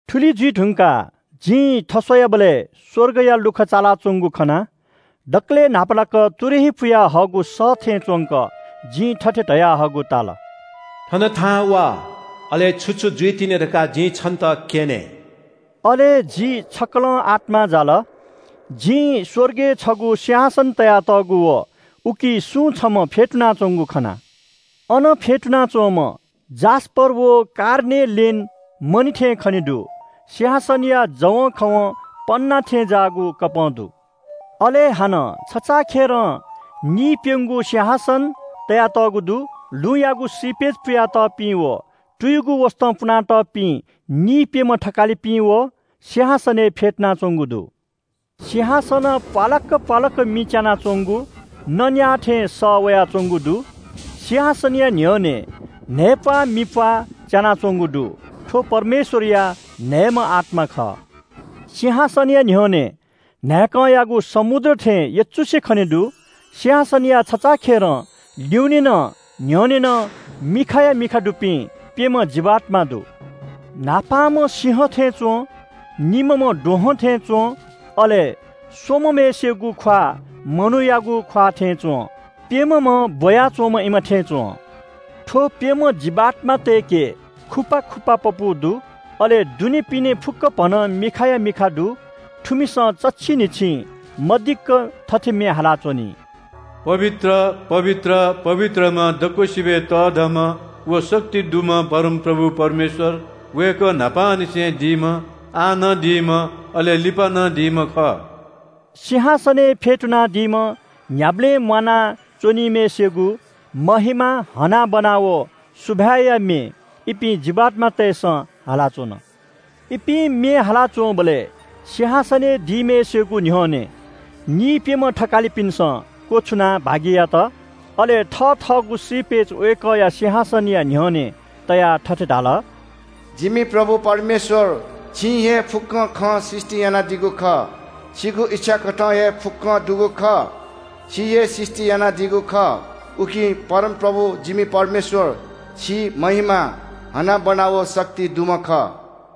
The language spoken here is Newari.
थुलि जुइ धुंकाः जिं थस्‍वयाबलय् स्‍वर्गया लुखा चालाच्‍वंगु खना। दकलय् न्‍हापालाक तुरही पुयाहःगु सः थें च्‍वंक जिं थथे धयाहःगु ताल – “थन थाहां वा, अले छु छु जुइतिनि धकाः जिं छन्‍त क्‍यने।” अले जि छक्‍कलं आत्‍मां जाल। जिं स्‍वर्गय् छगू सिंहासन तयातःगु व उकी सुं छम्‍ह फ्‍यतुनाच्‍वंगु खना। अन फ्‍यतुनाच्‍वंम्‍ह जास्‍पर व कार्नेलेन मणि थें खने दु। सिंहासनया जवंखवं पन्‍ना थें ज्‍याःगु इन्‍द्रेणी दु। अले हानं छचाखेरं निइप्‍यंगू सिंहासन तयातःगु दु। लुँयागु श्रीपेच पुया तःपिं व तुयुगु वसतं पुनातःपिं निइप्‍यम्‍ह थकालिपिं व सिंहासनय् फ्‍यतुनाच्‍वंगु दु। सिंहासनं प्‍वालाक्‍क प्‍वालाक्‍क मि च्‍यानाच्‍वंगु, न न्‍याः थें सः वयाच्‍वंगु दु। सिंहासनया न्‍ह्यःने न्‍हय्‌प्‍वाः मिप्‍वाः च्‍यानाच्‍वंगु दु। थ्‍व परमेश्‍वरया न्‍हय्‌म्‍ह आत्‍मा खः। सिंहासनया न्‍ह्यःने न्‍हाय्‌कंयागु समुद्र थें यचुसे खने दु। सिंहासनया छचाखेरं ल्‍युने नं न्‍ह्यःने नं मिखाया मिखा दुपिं प्‍यम्‍ह जीवात्‍मा दु। न्‍हापांम्‍ह सिंह थें च्‍वं, निम्‍हम्‍ह द्वहं थें च्‍वं, अले स्‍वम्‍हम्‍हय्‌सिगु ख्‍वाः मनूयागु ख्‍वाः थें च्‍वं, प्‍यम्‍हम्‍ह ब्‍वया च्‍वंम्‍ह इमा थें च्‍वं। थ्‍व प्‍यम्‍ह जीवात्‍मातय्‌के खुपा खुपा पपू दु, अले दुनेपिने फुक्‍कभनं मिखाया मिखा दु। थुमिसं चच्‍छि न्‍हिच्‍छिं मदिक्‍क थथे म्‍ये हालाच्‍वनी। “पवित्र, पवित्र, पवित्रम्‍ह दक्‍वसिबय् तःधंम्‍ह व शक्ति दुम्‍ह परमप्रभु परमेश्‍वर। वय्‌कः न्‍हापांनिसें दीम्‍ह, आः नं दीम्‍ह, अले लिपा नं दीम्‍ह खः।” सिंहासनय् फ्‍यतुनादीम्‍ह न्‍ह्याबलें म्‍वाना च्‍वनीम्‍हय्‌सिगु महिमा, हनाबना व सुभाय्‌या म्‍ये इपिं जीवात्‍मातय्‌सं हालाच्‍वन। इपिं म्‍ये हालाच्‍वंबलय् सिंहासनय् दीम्‍हय्‌सिगु न्‍ह्यःने निइप्‍यम्‍ह थकालिपिन्‍सं क्‍वछुनाः भागि यात। अले थथःगु श्रीपेच वय्‌कःया सिंहासनया न्‍ह्यःने तयाः थथे धाल – “जिमि प्रभु परमेश्‍वर, छिं हे फुक्‍कं खँ सृष्‍टि यानादीगु खः। छिगु इच्‍छा कथं हे फुक्‍कं दुगु खः, छिं हे सृष्‍टि यानादीगु खः। उकिं परमप्रभु जिमि परमेश्‍वर, छि महिमा, हनाबना व शक्ति दुम्‍ह खः।”